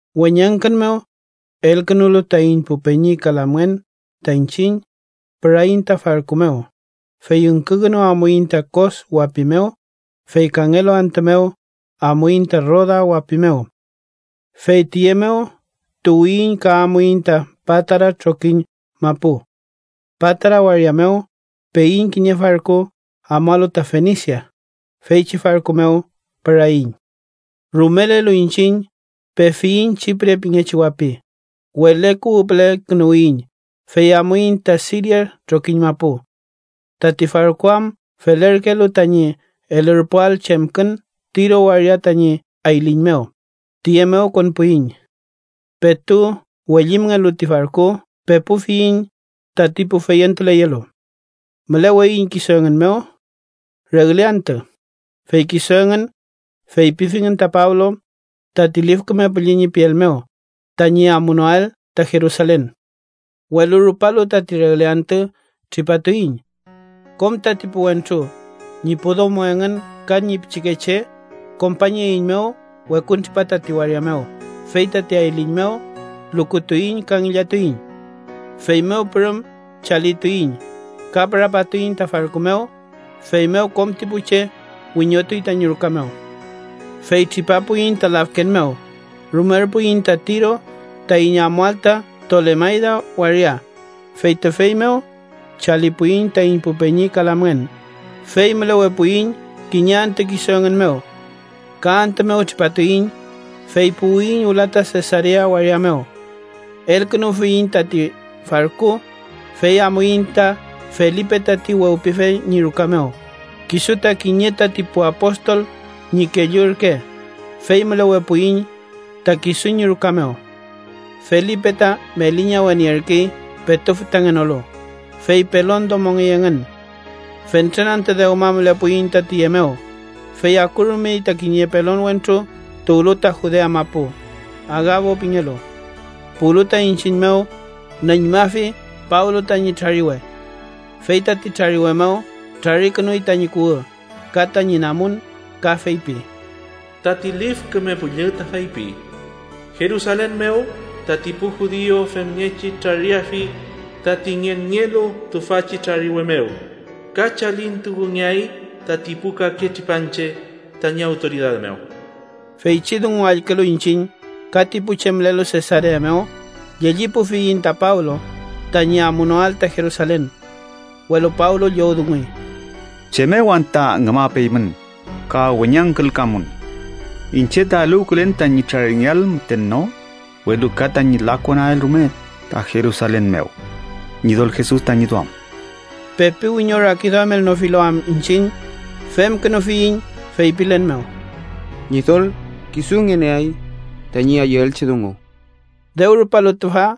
Weñangkün mew elkünulu taiñ pu peñi ka lamngen ta iñchiñ, püraiñ ta farku mew, fey üngkükünu amuiñ ta Kos wapi mew, fey kangelu antü mew amuiñ ta Roda wapi mew, fey tüye mew tuwiyiñ ka amuiñ ta Patara trokiñ mapu. Patara waria mew peiñ kiñe farku amualu ta Fenisia. Feychi farku mew püraiñ. Rumelelu iñchiñ, pefiyiñ Chipre pingechi wapi. Wele kuwü püle künuwiyiñ, fey amuiñ ta Siria trokiñ mapu. Tati farku am felerkelu tañi elürpuael chemkün Tiro waria tañi ayliñ mew, tiye mew konpuiñ. Petu wellimngelu ti farku, pepufiyiñ tati pu feyentuleyelu. Müleweiñ kisu engün mew regle antü, fey kisu engün feypifingün ta Pablo tati Lif Küme Püllü ñi piel mew tañi amunoael ta Jerusalen. Welu rupalu tati regle antü, tripatuiñ. Kom tati pu wentru, ñi pu domo engün ka ñi pichikeche, kompañeiñmew wekuntripa tati waria mew, fey tati ayliñ mew lukutuiñ ka ngillatuiñ. Feymew pürüm chalituiñ ka pürapatuiñ ta farku mew, feymew kom ti pu che wiñotuy tañi ruka mew. Fey tripapuiñ ta lafken mew, rumerpuiñ ta Tiro taiñ amuael ta Tolemayda waria, fey tüfey mew chalipuiñ taiñ pu peñi ka lamngen, fey mülewepuiñ kiñe antü kisu engün mew. Ka antü mew tripatuiñ, fey puwiyiñ wüla ta Sesarea waria mew. Elkünufiyiñ tati farku, fey amuiñ ta Felipe tati Wewpife ñi ruka mew, kisu ta kiñe tati pu apostol ñi kellu ürke, fey mülewepuiñ ta kisu ñi ruka mew. Felipe ta meli ñawe nierkey petu fütangenolu, fey pelon domongey engün. Fentren antü dewma mülepuiñ ta tüye mew, fey akurumey ta kiñe pelon wentru tuwlu ta Judea mapu, Agabo pingelu. Puwlu ta iñchiñ mew, nüñmafi Pablo tañi trariwe. Fey tati trariwe mew trarikünuy tañi kuwü ka tañi namun, ka feypi: —Tati Lif Küme Püllü ta feypi: ‘Jerusalen mew tati pu judiu femngechi trariafi tati ngenngelu tüfachi trariwe mew, ka chalintukungeay tati pu kake tripanche tañi awtoridad mew.’ Feychi dungu allkülu iñchiñ ka ti pu che mülelu Sesarea mew, llellipufiyiñ ta Pablo tañi amunoael ta Jerusalen. Welu Pablo llowdunguy: —¿Chem mew anta ngümapeymün ka weñangkülkamun? Iñche ta eluwkülen tañi traringeael müten no, welu ka tañi lakonael rume ta Jerusalen mew, Ñidol Jesus tañi duam. Pepi wiñorakiduamelnofilu am iñchiñ, femkünufiyiñ feypilen mew: “Ñidol kisu ngüneay tañi ayüelchi dungu.” Dew rupalu tüfa,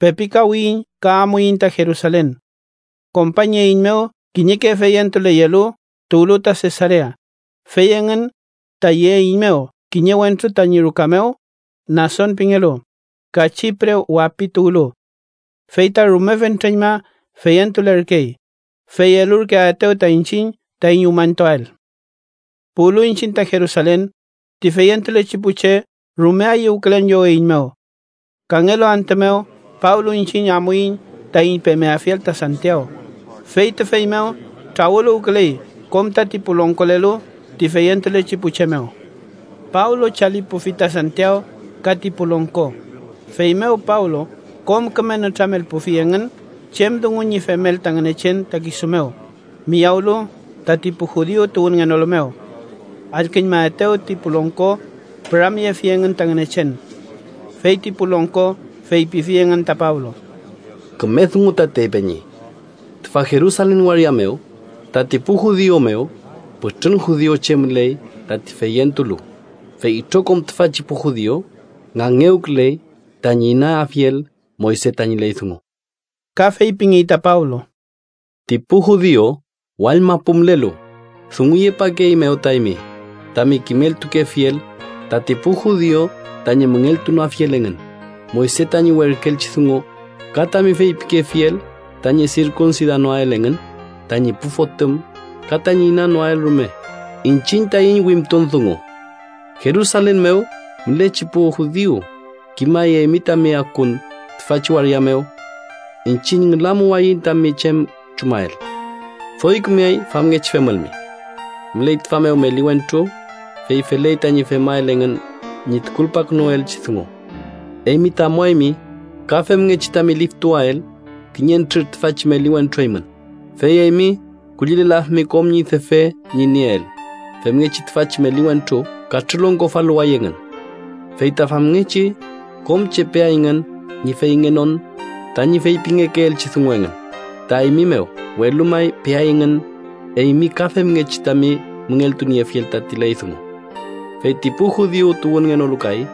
pepikawiyiñ ka amuiñ ta Jerusalen. Kompañeiñmew kiñeke feyentuleyelu tuwlu ta Sesarea, fey engün ta yeeiñmew kiñe wentru tañi ruka mew, Nason pingelu, ka Chipre wapi tuwlu. Fey ta rume fentreñma feyentulerkey, fey elurkeaetew ta iñchiñ taiñ umañtuael. Puwlu iñchiñ ta Jerusalen, ti feyentulechi pu che rume ayüwkülen lloweiñmew. Kangelu antü mew, Pablo iñchiñ amuiñ taiñ pemeafiel ta Santiaw, fey tüfey mew trawüluwküley kom tati pu longkolelu ti feyentulechi pu che mew. Pablo chalipufi ta Santiaw ka ti pu longko, feymew Pablo kom küme nütramelpufi engün chem dungu ñi femel ta Ngünechen ta kisu mew, miyawlu tati pu judiu tuwünngenolu mew. Allküñmaetew ti pu longko, püramyefi engün ta Ngünechen. Fey ti pu longko feypifi engün ta Pablo: —Küme dungu tatey, peñi. Tüfa Jerusalen waria mew tati pu judiu mew pütrün judiuche müley tati feyentulu, fey itrokom tüfachi pu judiu ngangewküley tañi inanieafiel Moyse tañi ley dungu. Ka feypingey ta Pablo: —Ti pu judiu wall mapu mülelu dunguyepakeeymew ta eymi tami kimeltukefiel tati pu judiu tañi müngeltunoafiel engün Moyse tañi werküelchi dungu, ka tami feypikefiel tañi sirkunsidanoael engün tañi pu fotüm ka tañi inanoael rume iñchiñ taiñ wimtun dungu. Jerusalen mew mülechi pu judiu kimay eymi tami akun tüfachi waria mew. Iñchiñ ngülamuwayiñ tami chem chumael. Doy kümeay famngechi femülmi: Müley tüfa mew meli wentru, fey feley tañi femael engün ñi tukulpakünuelchi dungu. Eymi ta amuaymi ka femngechi tami liftuwael kiñentrür tüfachi meli wentru eymün, fey eymi kullilelafimi kom ñi defe ñi nieel, femngechi tüfachi meli wentru katrülongkofaluway engün. Fey ta famngechi kom che peayngün ñi feyngenon tañi feypingekeelchi dungu engün ta eymi mew, welu may peayngün eymi ka femngechi tami müngeltuniefiel tati ley dungu. Fey ti pu judiu tuwünngenolu kay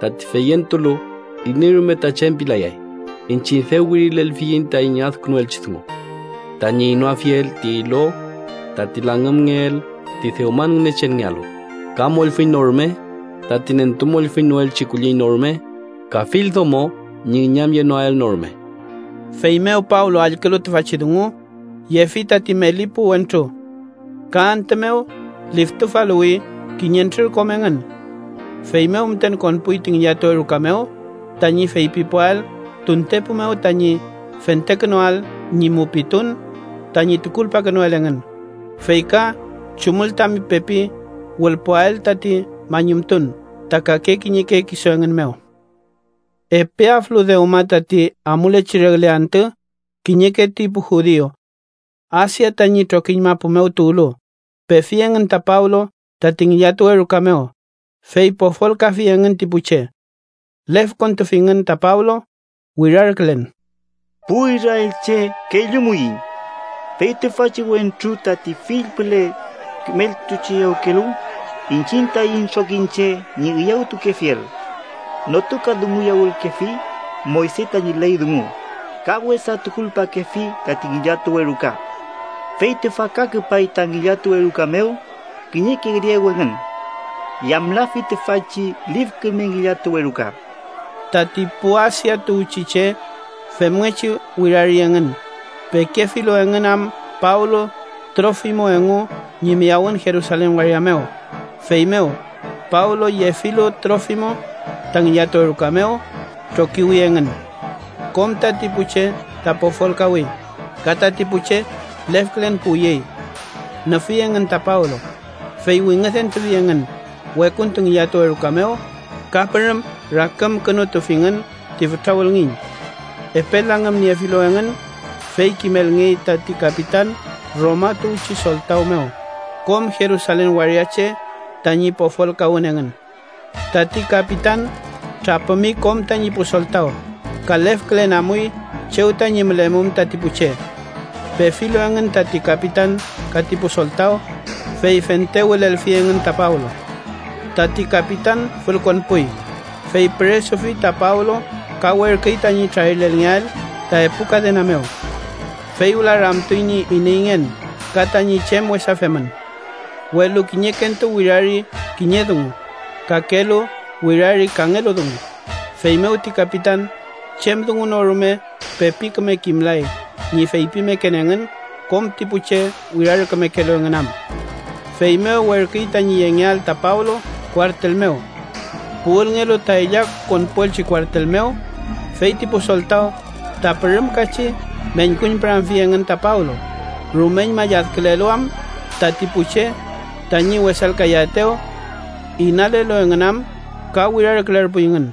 tati feyentulu iney rume ta chem pilayay, iñchiñ dew wirilelfiyiñ taiñ adkünuelchi dungu: Tañi inoafiel ti ilo tati langümelngeel ti dewman ngünechenngealu, ka mollfüñ no rume, tati nentumollfüñnoelchi kulliñ no rume, ka fill domo ñi üñamyenoael no rume. Feymew Pablo allkülu tüfachi dungu, yefi tati meli pu wentru. Ka antü mew liftufaluwi kiñentrür kom engün. Feymew müten konpuy ti ngillatuwe ruka mew tañi feypipuael tuntepu mew tañi fentekünuael ñi mupitun tañi tukulpakünuel engün, fey ka chumül tami pepi wülpuael tati mañumtun ta kake kiñeke kisu engün mew. Epe aflu dewma tati amulechi regle antü, kiñeke ti pu judiu Asia tañi trokiñ mapu mew tuwlu, pefi engün ta Pablo tati ngillatuwe ruka mew, fey pofolkafi engün ti pu che. Lefkontufingün ta Pablo wirarkülen: “¡Pu israelche, kellumuiñ! Fey tüfachi wentru tati fill püle kimeltucheyawkelu iñchiñ taiñ trokiñche ñi üyawtukefiel. Notukadunguyawülkefi Moyse tañi ley dungu ka wesa tukulpakefi tati ngillatuwe ruka. Fey tüfa ka küpay ta ngillatuwe ruka mew kiñeke griegu engün. Yamlafi tüfachi lif küme ngillatuwe ruka.” Tati pu Asia tuwchi che femngechi wirari engün, pekefilu engün am Pablo Trofimo engu ñi miyawün Jerusalen waria mew, feymew “Pablo yefilu Trofimo ta ngillatuwe ruka mew” trokiwi engün. Kom tati pu che ta pofolkawi, ka tati pu che lefkülen puwyey. Nüfi engün ta Pablo, fey wingüdentufi engün wekuntu ngillatuwe ruka mew, ka pürüm rakümkünutufingün ti fütra wülngiñ. Epe langümniefilu engün, fey kimelngey tati kapitan Roma tuwchi soltaw mew, kom Jerusalen waria che tañi pofolkawün engün. Tati kapitan trapümi kom tañi pu soltaw, ka lefkülen amuy chew tañi mülemum tati pu che. Pefilu engün tati kapitan ka ti pu soltaw, fey fente wülelfi engün ta Pablo. Tati kapitan fülkonpuy, fey püresufi ta Pablo ka werküy tañi trarilelngeael ta epu kadena mew. Fey wüla ramtuy ñi ineyngen ka tañi chem wesa femün. Welu kiñekentu wirari kiñe dungu, kakelu wirari kangelu dungu, feymew ti kapitan chem dungu no rume pepi küme kimlay ñi feypimeken engün kom ti pu che wirarkümekelu engün am. Feymew werküy tañi yengeael ta Pablo kuartel mew. Puwülngelu ta ella konpuelchi kuartel mew, fey ti pu soltaw ta pürümkachi meñkuñpüramfi engün ta Pablo, rumeñma lladkülelu am tati pu che tañi wesalkayaetew. Inalelu engün am ka wirarkülerpuyngün: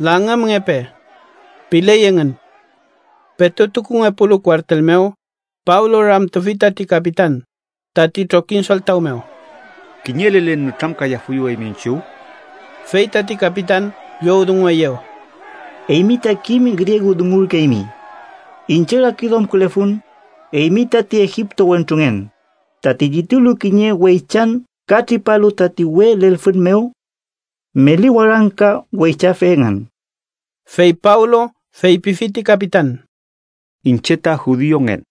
“¡Langümngepe!” piley engün. Petu tukungepulu kuartel mew, Pablo ramtufi tati kapitan tati trokiñ soltaw mew: —¿Kiñe lelen nütramkayafuyu eymi iñchiw? Fey tati kapitan llowdungueyew: —¿Eymi ta kim griegu dungurkeymi? Iñche rakiduamkülefun eymi tati egipto wentrungen, tati llitulu kiñe weychan ka tripalu tati uwe lelfün mew meli warangka weychafe engün. Fey Pablo feypifi ti kapitan: —Iñche ta judiungen.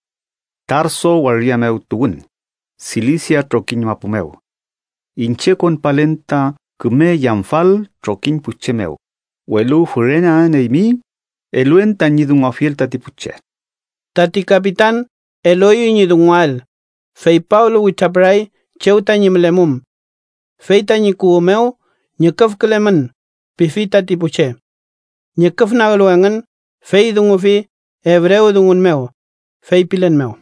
Tarso waria mew tuwün, Silisia trokiñ mapu mew. Iñche konpalen ta küme yamfal trokiñ pu che mew, welu füreneaen eymi, eluen tañi dunguafiel tati pu che. Tati kapitan elueyew ñi dunguael, fey Pablo witrapüray chew tañi mülemum. Fey tañi kuwü mew “ñüküfkülemün” pifi tati pu che. Ñüküfnaglu engün, fey dungufi ebrewdungun mew, feypilen mew: